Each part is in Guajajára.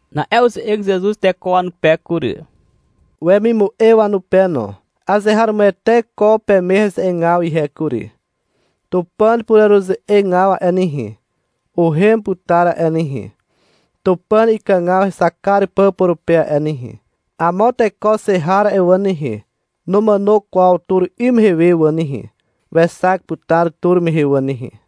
Na'e uze'eg Zezuz teko wanupe kury, wemimu'e wanupe no. — Azeharomoete ko peme heze'egaw ihe kury. Tupàn pureruze'egaw a'e nehe, uhem putar a'e nehe, Tupàn ikàgaw hexak kar pà purupe a'e nehe. Amo teko xe har a'e wà nehe, numàno kwaw tur 'ym mehe wà nehe. Wexak putar tur mehe wà nehe.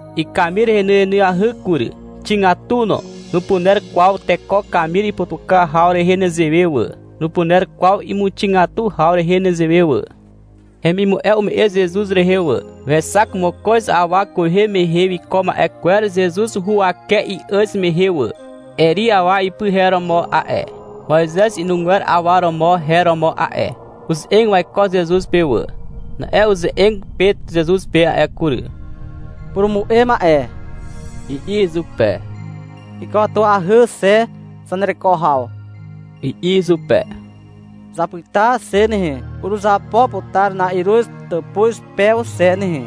Ikamir henyenyahy kury, xigatu no. Nupuner kwaw teko kamir iputuka haw rehe nezewe wà, nupuner kwaw imuxigatu haw rehe nezewe wà. Hemimu'e ume'e Zezuz rehe wà. Wexak mokoz awa kwehe mehe wiko ma'e kwer Zezuz huwake i'àz mehe wà. Eri awa ipy her romo a'e. Moizez inugwer awa romo her romo a'e. Uze'eg waiko Zezuz pe wà. Na'e uze'eg Pet Zezuz pe a'e kury. — Purumu'e ma'e, i'i izupe. — Ikatuahy xe zanereko haw, i'i izupe. — Zapyta xe nehe, uruzapo putar na'iruz tàpuz pew xe nehe,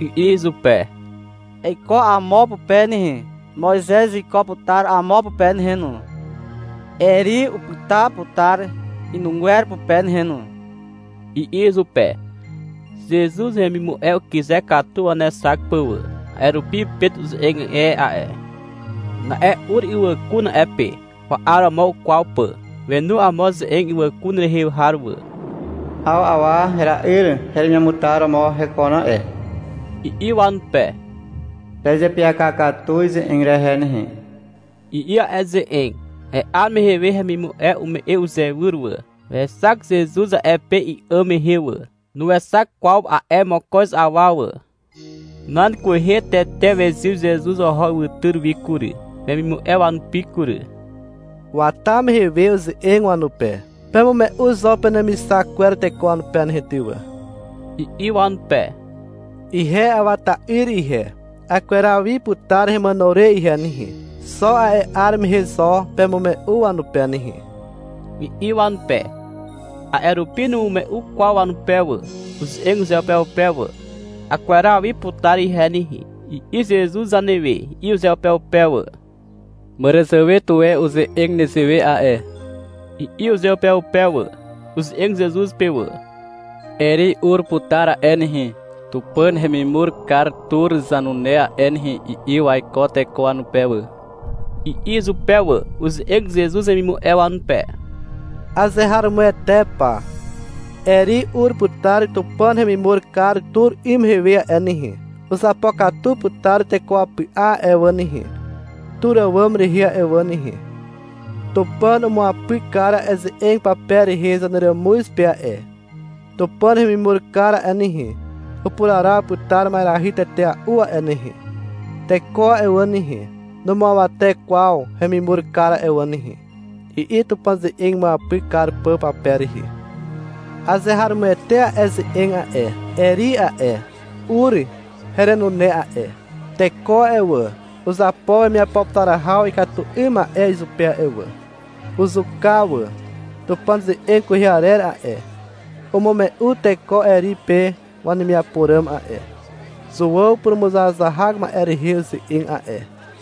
i'i izupe. — Eiko amo pupe nehe. Moizez wiko putar amo pupe nehe no. Eri upyta putar inugwer pupe nehe no, i'i izupe. Zezuz hemimu'e ukyze katu wanexak pà wà. A'e rupi Pet uze'eg e a'e. Na'e ur ywàkun a'e pe, wa'aromo ukwaw pà. Wenu amo ze'eg ywàkun rehe har wà. — 'Aw awa hera'yr heremiamutar romo hekon a'e, i'i wanupe. — Pezeapyaka katu ize'eg rehe nehe, i'i a'e ze'eg. A'e 'ar mehe we hemimu'e ume'e uzeiwyr wà. Wexak Zezuz a'e pe i'àm mehe wà. Nuexak kwaw a'e mokoz awa wà. Nan kwehe tete wezyw Zezuz oho ywytyr wi kury, wemimu'e wanupi kury. Wata mehe we uze'eg wanupe. — Pemume'u zo penemixak kwer teko wanupe nehe ty wà, i'i wanupe. — Ihe Awa ta'yr ihe. Akweraw wi putar hemàno re ihe nehe. Xo a'e 'ar mehe zo pemume'u wanupe nehe, i'i wanupe. A'e rupi numume'u kwaw wanupe wà. Uze'eg uzeupeupe wà. — Akweraw wi putar ihe nehe, i'i Zezuz zanewe, i'i uzeupeupe wà. — Màràzàwe tuwe uze'eg nezewe a'e, i'i uzeupeupe wà. Uze'eg Zezuz pe wà. — Eri ur putar a'e nehe, Tupàn hemimur kar tur zanune a'e nehe, i'i waiko teko wanupe wà, i'i izupe wà. Uze'eg Zezuz wemimu'e wanupe. — Azeharomoete pa. Eri ur putar Tupàn remimur kar tur 'ym mehe we a'e nehe. Uzapokatu putar teko wapy'a a'e wà nehe, tur àwàm rehe a'e wà nehe. Tupàn umuapyk kar a'e ze'eg pape rehe zaneràmuz pe a'e. Tupàn hemimur kar a'e nehe, upuraraw putar ma'erahy tetea'u a'e nehe. Teko a'e wà nehe, numuawate kwaw hemimur kar a'e wà nehe, i'i Tupàn uze'eg imuapyk kar pà pape rehe. Azeharomoete a'e ze'eg a'e. Eri a'e, ur herenune a'e. Teko a'e wà, uzapo wemiapo putar haw ikatu 'ym ma'e izupe a'e wà. Uzuka wà. Tupàn ze'eg kwehe arer a'e, umume'u teko Eri pe wanemiapo ràm a'e. (Zuàw purumuzahazahak ma'e rehe uze'eg a'e.)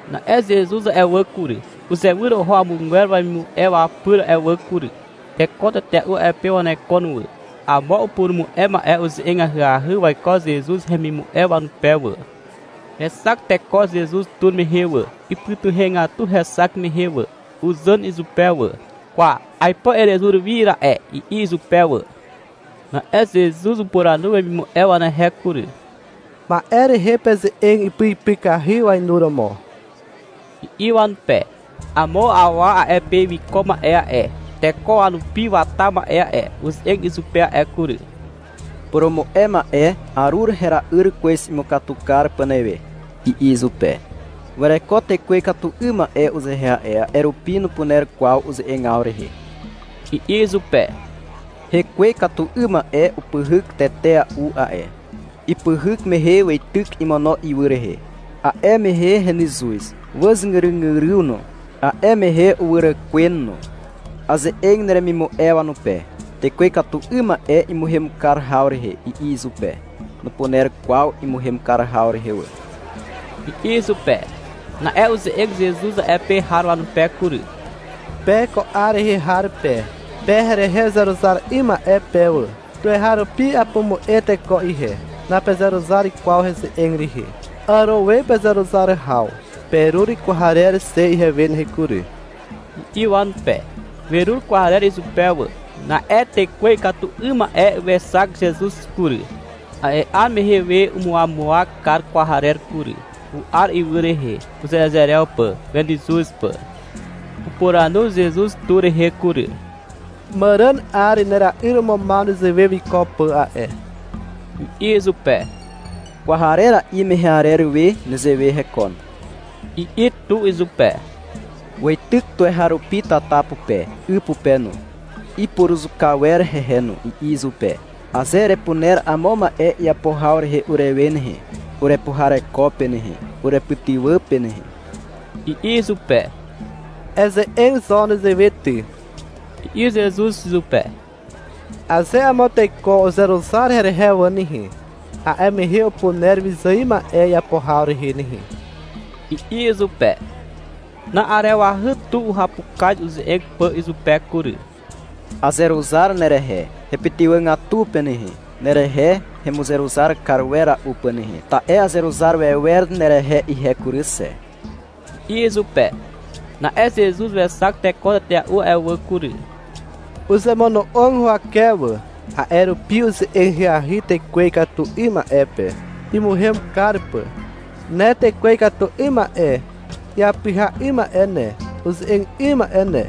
Na'e Zezuz a'e wà kury, uzewyr oho amogwer wemimu'e wapyr a'e wà kury. Teko tetea'u a'e pe wanekon wà. Amo upurumu'e ma'e uze'eg ahyahy waiko Zezuz hemimu'e wanupe wà. Wexak teko Zezuz tur mehe wà. Ipytuhegatu hexak mehe wà. Uzàn izupe wà. — Kwa, aipo erezur wi ra'e, i'i izupe wà. Na'e Zezuz upuranu wemimu'e wanehe kury. — Ma'e rehe peze'eg ipyipykahy wainuromo, i'i wanupe. Amo awa a'e pe wiko ma'e a'e, teko wanupi wata ma'e a'e, uze'eg izupe a'e kury. — Purumu'e ma'e, arur hera'yr kwez imukatu kar pà newe, i'i izupe. — Wereko tekwe ikatu 'ym ma'e uzehe a'e. A'e rupi nupuner kwaw uze'egaw rehe, i'i izupe. — Hekwe ikatu 'ym ma'e upyhyk tetea'u a'e. Ipyhyk mehe weityk imono ywy rehe. A'e mehe henyzuz. Wàzgyrygyryw no. A'e mehe uwyràkwen no. Aze'eg neremimu'e wanupe, tekwe ikatu 'ym ma'e imuhem kar haw rehe, i'i izupe. — Nupuner kwaw imuhem kar haw rehe wà, i'i izupe. Na'e uze'eg Zezuz a'e pe har wanupe kury. — Pe ko 'ar rehe har pe, pe herehe uzeruzar 'ym ma'e pe wà. Tuweharupi apumu'e teko ihe. Napezeruzar kwaw heze'eg rehe. Àro we pezeruzar haw. Perur kwarer xe ihewe nehe kury, i'i wanupe. Werur kwarer izupe wà. Na'e tekwe ikatu 'ym ma'e wexak Zezuz kury. A'e 'ar mehe we umuwamuwak kar kwarer kury. U'ar ywy rehe, uzerezerew pà, wenyzuz pà. Upuranu Zezuz tu rehe kury. — Màràn 'ar nera'yr umumaw nezewe wiko pà a'e, i'i izupe. — Kwarera'i mehe arer we nezewe hekon, i'i tu izupe. — Weityk tuweharupi tata pupe, 'y pupe no. Ipuruzuka wer hehe no, i'i izupe. — Aze erepuner amo ma'e iapo haw rehe urewe nehe, urepuhareko pe nehe, urepytywà pe nehe, i'i izupe. — Eze'eg zo nezewe ty, i'i Zezuz izupe. — Aze amo teko uzeruzar herehe wà nehe, a'e mehe upuner wyzài ma'e iapo haw rehe nehe, i'i izupe. Na'arewahy tu uhapukaz uze'eg pà izupe kury. — Azeruzar nerehe, hepytywàgatu pe nehe, nerehe hemuzeruzar kar wera'u pà nehe, ta'e azeruzar wewer nerehe ihe kury xe, i'i izupe. Na'e Zezuz wexak teko tetea'u a'e wà kury. Uzemono'og huwake wà. A'e rupi uze'eg ahyahy tekwe ikatu 'ym ma'e pe, imuhem kar pà. — Ne tekwe ikatu 'ym ma'e iapyha 'ym ma'e ne, uze'eg 'ym ma'e ne,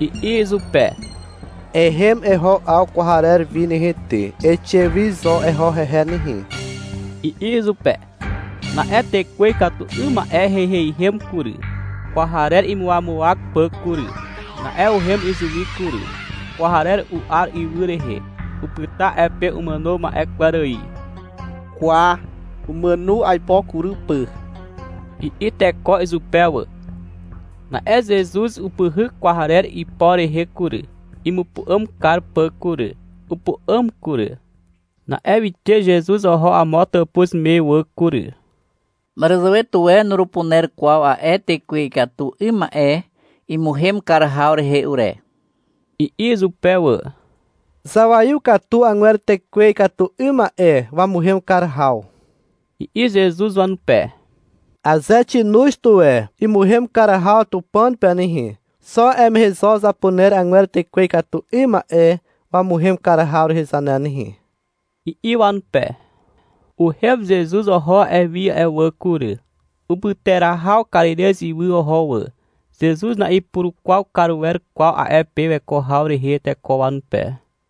i'i izupe. — Ehem eho 'aw kwarer wi nehe ty, eixe wi zo eho hehe nehe, i'i izupe. Na'e tekwe ikatu 'ym ma'e heiheihem kury, kwarer imuwamuwak pà kury. Na'e uhem izuwi kury. Kwarer u'ar ywy rehe. Upyta a'e pe umàno ma'e kwer ài. — Kwa, umàno aipo kury pà, i'i teko izupe wà. Na'e Zezuz upyhyk kwarer ipo rehe kury, imupu'àm kar pà kury. Upu'àm kury. Na'e wixe Zezuz oho amo tàpuz me wà kury. — Màràzàwe tuwe nurupuner kwaw a'e tekwe ikatu 'ym ma'e imuhem kar haw rehe ure, i'i izupe wà. Zawaiw katu agwer tekwe ikatu 'ym ma'e wamuhem kar haw, i'i Zezuz wanupe. — Aze xinoz tuwe imuhem kar haw Tupàn pe nehe, xo a'e mehe zo zapuner 'agwer tekwe ikatu 'ym ma'e wamuhem kar haw rehe zane nehe, i'i wanupe. Uhem Zezuz oho a'e wi a'e wà kury. Upyterahaw Karirez ywy oho wà. Zezuz na'ipurukwaw kar wer kwaw a'e pe weko haw rehe teko wanupe.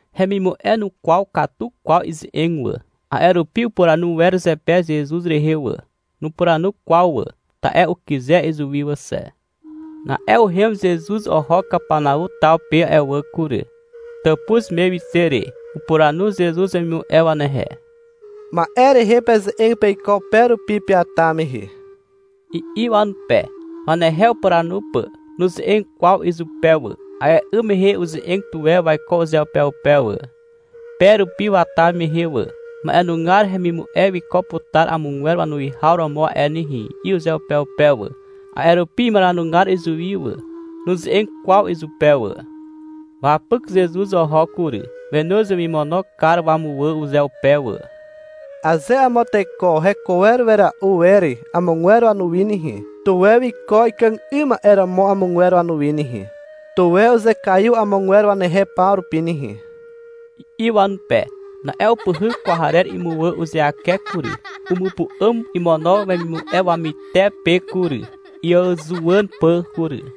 Hemimu'e nukwaw katu kwaw ize'eg wà. A'e rupi ipuranu wer zepe Zezuz rehe wà. Nupuranu kwaw wà, ta'e ukyze izuwi wà xe. Na'e uhem Zezuz oho Kapanau taw pe a'e wà kury. Tàpuz me wixe re, upuranu Zezuz wemimu'e wanehe. — Ma'e rehe peze'eg peiko pe rupi peata mehe, i'i wanupe, wanehe upuranu pà. Nuze'eg kwaw izupe wà. A'e 'ym mehe uze'eg tuwe waiko uzeupeupe wà, pe rupi wata mehe wà. — Ma'enugar hemimu'e wiko putar amogwer wanuwihaw romo a'e nehe, i'i uzeupeupe wà. A'e rupi imaranugar izuwi wà. Nuze'eg kwaw izupe wà. Wapyk Zezuz oho kury. Wenoz wemimono kar wamuwà uzeupe wà. — Aze amo teko heko wera'u wer amogwer wanuwi nehe, tuwe wiko ikàg 'ym ma'e romo amogwer wanuwi nehe, tuwe uzekaiw amogwer wanehe paw rupi nehe, i'i wanupe. Na'e upyhyk kwarer imuwà uzeake kury. Umupu'àm imono wemimu'e wamytepe kury, iàzuwàn pà kury.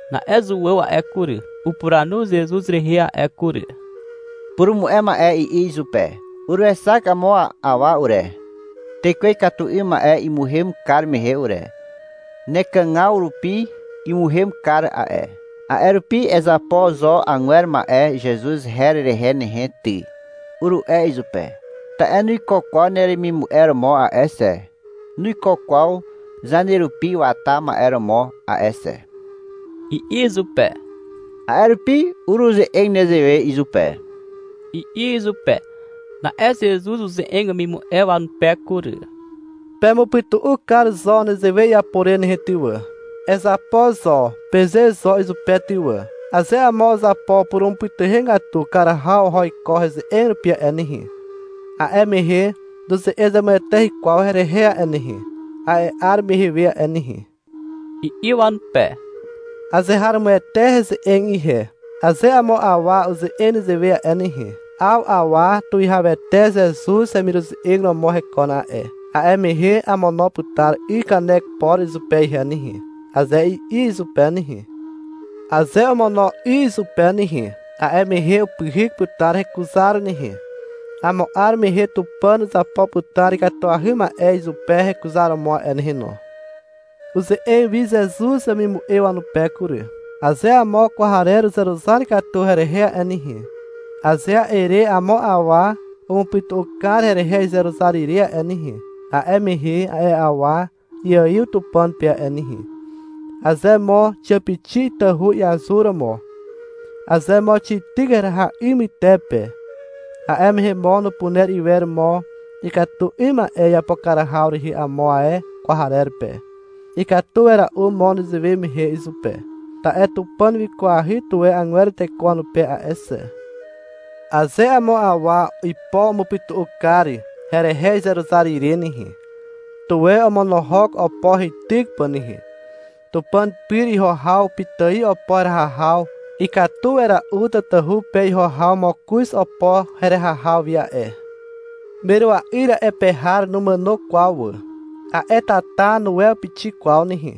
Na'e Zuàw a'e kury, upuranu Zezuz rehe a'e kury. — Purumu'e ma'e, i'i izupe. Uruexak amo awa ure, tekwe ikatu 'ym ma'e imuhem kar mehe ure. Nekàgaw rupi imuhem kar a'e. A'e rupi — Ezapo zo agwer ma'e Zezuz her rehe nehe ty, uru'e izupe. Ta'e nuiko kwaw neremimu'e romo a'e xe, nuiko kwaw zanerupi wata ma'e romo a'e xe, i'i izupe. — A'e rupi uruze'eg nezewe izupe, i'i izupe. Na'e Zezuz uze'eg wemimu'e wanupe kury. — Pemupytu'u kar zo nezewe iapo re nehe ty wà. — Ezapo zo, peze zo izupe ty wà. Aze amo uzapo purumupytuhegatu kar haw oho iko heze'eg rupi a'e nehe, a'e mehe nuze'eg zemueteahy kwaw herehe a'e nehe, a'e 'ar mehe we a'e nehe, i'i wanupe. Azeharomoete heze'eg ihe, aze amo awa uze'eg nezewe a'e nehe, — 'Aw awa Tuwihawete Zezuz hemiruze'eg romo hekon a'e, a'e mehe amono putar 'y kanek por izupe ihe nehe, aze i'i izupe nehe, aze omono 'y izupe nehe, a'e mehe upyhyk putar hekuzar nehe. Amo 'ar mehe Tupàn uzapo putar ikatuahy ma'e izupe hekuzaromo a'e nehe no. Uze'eg wi Zezuz wemimu'e wanupe kury. — Aze amo kwarer uzeruzar katu herehe a'e nehe, aze a'e re amo awa umupytu'u kar herehe izeruzar ire a'e nehe, a'e mehe a'e awa iaiw Tupàn pe a'e nehe. Aze mo xiàpixi itahu iazuromo, aze mo xityk heraha 'y mytepe, a'e mehe mo nupuner iwer mo ikatu 'ym ma'e iapo kar haw rehe amo ae kwarer pe. Ikatu wera'u mo nezewe mehe izupe. Ta'e Tupàn wikwahy tuwe agwer teko wanupe a'e xe. Aze amo awa ipo umupytu'u kar herehe izeruzar ire nehe, tuwe omonohok opo heityk pà nehe. Tupàn pyr iho haw pitài opo heraha haw ikatu wera'u tatahu pe iho haw mokoz opo heraha haw wi a'e. [Merua'yr a'e pe har numàno kwaw wà. A'e tata nuwew pixik kwaw nehe].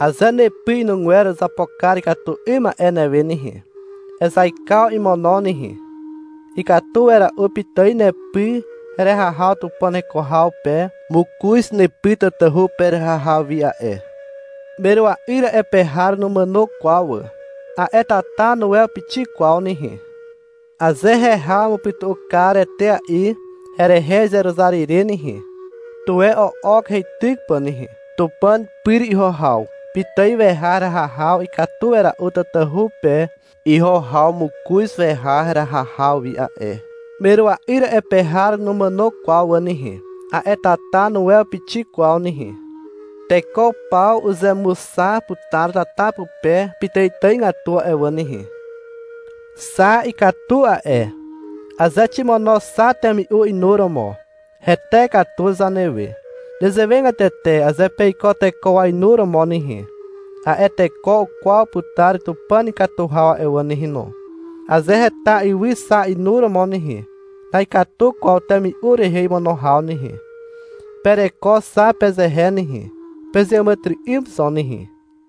Aze nepy inugwer uzapo kar ikatu 'ym ma'e newe nehe, ezaikaw imono nehe. Ikatu wera'u pitài nepy heraha haw Tupàn heko haw pe mokoz nepy tatahu pe heraha haw wi a'e. [Merua'yr a'e pe har numàno kwaw wà. A'e tata nuwew pixik kwaw nehe]. Aze heha umupytu'u kar etea'i herehe izeruzar ire nehe, tuwe o'ok heityk pà nehe. Tupàn pyr iho haw pitài weha heraha haw ikatu wera'u tatahu pe iho haw mokoz weha heraha haw wi a'e. Merua'yr a'e pe har numàno kwaw wà nehe. A'e tata nuwew pixik kwaw nehe. Teko paw uzemuxa putar tata pupe pitàitàigatu a'e wà nehe. Xa ikatu a'e. (Aze ximono xa temi'u inuromo, hete katu zanewe. Nezewegatete aze peiko teko wainuromo nehe, a'e teko ukwaw putar Tupàn ikatu haw a'e wà nehe no.) Aze heta ywy xa inuromo nehe, na'ikatu kwaw temi'u rehe imono haw nehe. Pereko xa pezehe nehe, pezeàmàtyry'ym zo nehe.